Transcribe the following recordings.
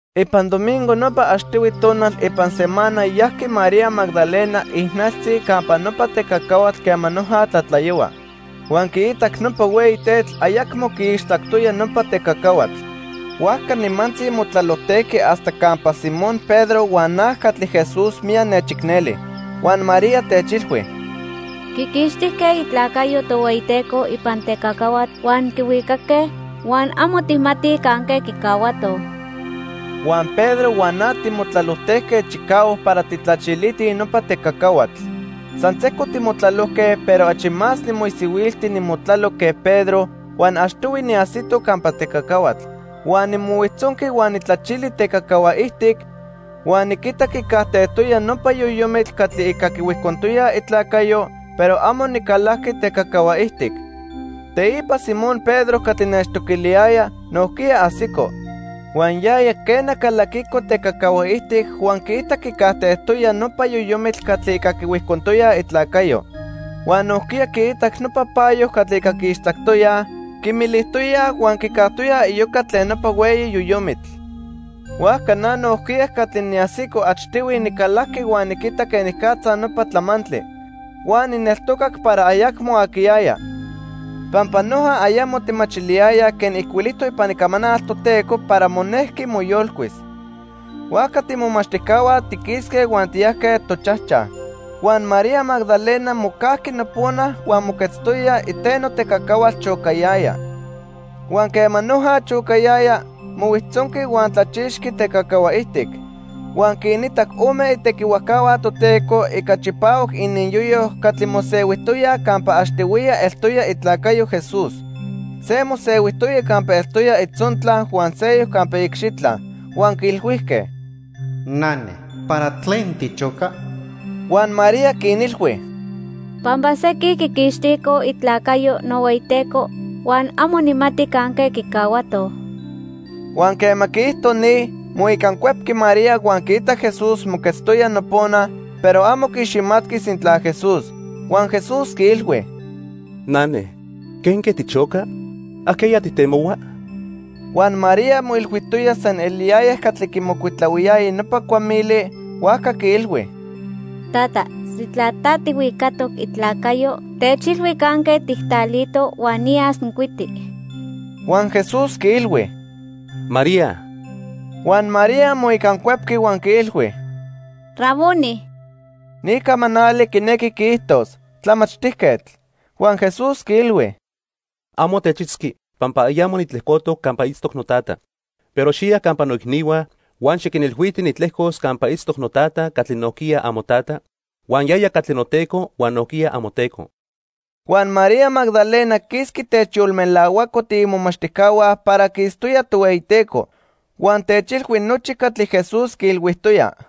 Ipan domingo nopa achtihui tonal ipan semana yajqui María Magdalena ijnaltzi campa nopa tecacahuatl quema noja tlatlayohua. Huan quiitac nopa hueyi tetl ayacmo quiixtzactoya nopa tecacahuatl. Huajca nimantzi motlalojtejqui hasta campa Simón Pedro huan na catli Jesús miyac nechicneli. Huan María techilhui: —Quiquixtijque itlacayo Tohueyiteco ipan tecacahuatl huan quihuicaque, huan amo tijmatij canque quicahuatoj. Huan Pedro huan na timotlalojtejque chicahuac para tijtlachilitij nopa tecacahuatl. San sejco timotlalojque, pero achi más nimoisihuilti nimotlalo que Pedro huan achtihui niajsito campa tecacahuatl. Huan nimohuijtzonqui huan nijtlachili tecacahua ijtic, huan niquitac quicajtejtoya nopa yoyomitl catli ica quihuijcontoyaj itlacayo, pero amo nicalajqui tecacahua ijtic. Teipa Simón Pedro catli nechtoquiliyaya, nojquiya ajsico. Huan yaya, quena, calaquico tecacahua ijtic, huan quiitac quicajtejtoya nopa yoyomitl catli ica quihuijcontoyaj itlacayo. Huan nojquiya quiitac nopa payo catli ica quiixtzactoyaj, quimilijtoyaj huan quicajtoya iyoca tlen nopa hueyi yoyomitl. Huajca na nojquiya catli niajsico achtihui nicalajqui huan niquitac quenicatza nopa tlamantli. Huan nijneltocac para ayacmo aquiyaya. Pampa noja ayamo tijmachiliyayaj quen ijcuilijtoc ipan Icamanal Toteco para monejqui moyolcuis. Huajca tiimomachtijcahua tiquisque huan tiyajque tochajchaj. Huan María Magdalena mocajqui nopona huan moquetztoya iteno tecacahuatl chocayaya. Huan quema noja chocayaya, mohuijtzonqui huan tlachixqui tecacahua ijtic. Huan quinitac ome itequihuajcahua Toteco ica chipahuac ininyoyo catli mosehuijtoyaj campa achtihuiya eltoya itlacayo Jesús. Se mosehuijtoya campa eltoya itzontla huan seyoc campa iicxitla. Huan quiilhuijque: —Nane, ¿para tlen tichoca? Huan María quinilhui: —Pampa sequin quiquixticoj itlacayo nohueyiTeco huan amo nijmati canque quicahuatoj. Huan quema quiijto ni, moicancuepqui María huan quiitac Jesús moquetztoya nopona, pero amo quiiximatqui sintla Jesús. Huan Jesús quiilhui: —Nane, ¿quenque tichoca? ¿Ajqueya tijtemohua? Huan María moilhuijtoya san eliyaya catli quimocuitlahuiyaya nopa cuamili, huajca quiilhui: —Tata, sintla ta tijhuicatoc itlacayo, techilhui canque tijtlalito huan niyas nijcuiti. Huan Jesús quiilhui: —¡María! Huan María moicancuepqui huan quiilhui: —¡Raboni! (Ni camanali quinequi quiijtos: Tlamachtijquetl.) Huan Jesús quiilhui: —Amo techitzqui pampa ayamo nitlejcotoc campa itztoc noTata. Pero xiya campa noicnihua huan xiquinilhuiti nitlejcos campa itztoc noTata catli nojquiya amoTata huan yaya catli noTeco huan nojquiya amoTeco. Huan María Magdalena quisqui techyolmelahuaco tiimomachtijcahua para quiitztoya Tohueyiteco. Huan techilhui nochi catli Jesús quiilhuijtoya.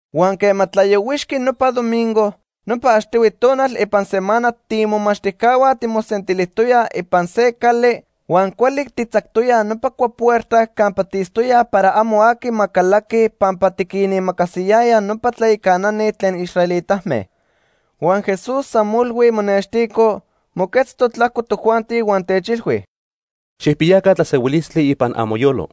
Huan quema tlayohuixqui nopa domingo, nopa achtihui tonal ipan semana tiimomachtijcahua timosentilijtoyaj ipan se cali huan cuali tijtzactoyaj nopa cuapuerta campa tiitztoyaj para amo aqui ma calaqui pampa tiquinimacasiyayaj nopa tlayacanani tlen israelitame. Huan Jesús san molhui monextico, moquetztoc tlajco tojuanti, huan techilhui: —Xijpiyaca tlasehuilistli ipan amoyolo.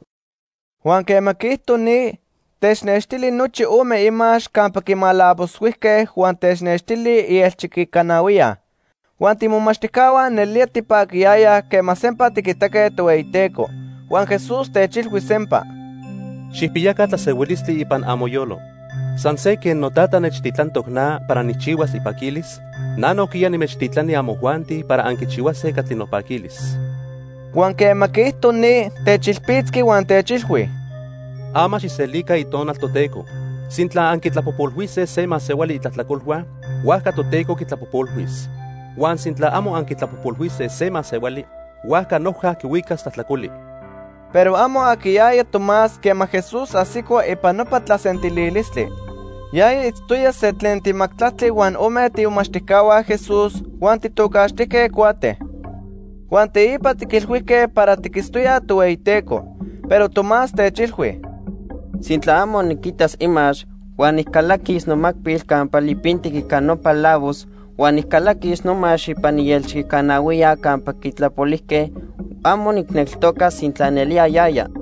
Huan quema quiijto ni, technextili nochi ome imax campa quimalavoshuijque huan technextili ielchiquicanahuiya. Huan tiimomachtijcahua nelía tipaquiyayaj quema sempa tiquitaque Tohueyiteco. Huan Jesús techilhui sempa: —Xijpiyaca tlasehuilistli ipan amoyolo. San se quen noTata nechtitlantoc na para nijchihuas ipaquilis, na nojquiya nimechtitlani amojuanti para anquichihuase catli nopaquilis. Huan quema quiijto ni, techilpitzqui huan techilhui: —Ama xijselica Itonal Toteco. Sintla anquitlapojpolhuise se masehuali itlajtlacolhua, huajca Toteco quitlapojpolhuis. Huan sintla amo anquitlapojpolhuise se masehuali, huajca noja quihuicas tlajtlacoli. Pero amo aquiyaya Tomás quema Jesús ajsico ipan nopa tlasentililistli. Yaya itztoya se tlen timajtlactli huan ome tiimomachtijcahua Jesús, huan tijtocaxtijque Cuate. Huan teipa tiquilhuijque para tiquitztoyaj Tohueyiteco. Pero Tomás techilhui: —Sintla amo niquitas imax huan nijcalaquis nomacpil campa lipintic ica nopa lavos huan nijcalaquis nomax ipan ielchiquicanahuiya campa quitlapolijque, amo nijneltocas sintla nelía yaya.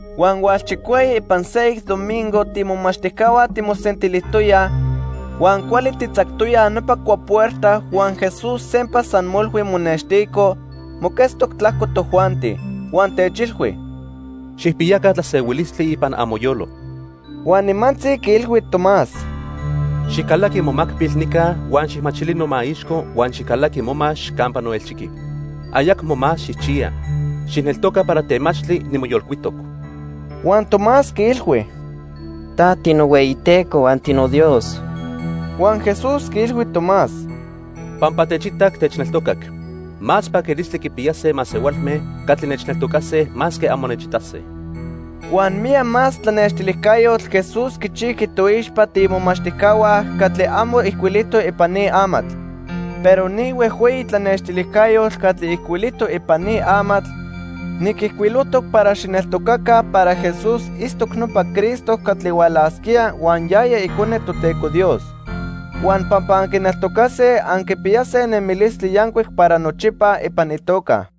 Huan hualchicueyi ipan seyoc domingo tiimomachtijcahua timosentilijtoyaj huan cuali tijtzactoyaj nopa cuapuerta huan Jesús sempa san molhui monextico, moquetztoc tlajco tojuanti. Huan techilhui: —Xijpiyaca tlasehuilistli ipan amoyolo. Huan nimantzi quiilhui Tomás: —Xijcalaqui momacpil nica huan xijmachili nomaixco huan xijcalaqui momax campa noelchiqui. Ayacmo más xijchiya. Xijneltoca para temachtli nimoyolcuitoc. Huan Tomás quiilhui: —Ta tinohueyiTeco huan tinoDios. Huan Jesús quiilhui Tomás: —Pampa techitac, techneltocac. Más paquilistli quipiyase masehualme catli nechneltocase masque amo nechitase. Huan miyac más tlanextilijcayotl Jesús quichijqui toixpa tiimomachtijcahua catli amo ijcuilijtoc ipan ni amatl. Pero ni huejhueyi tlanextilijcayotl catli ijcuilijtoc ipan ni amatl, niquijcuilojtoc para xijneltocaca para Jesús itztoc nopa Cristo catli hualasquía huan yaya Icone Toteco Dios. Huan pampa anquineltocase, anquipiyase nemilistli yancuic para nochipa ipan itoca.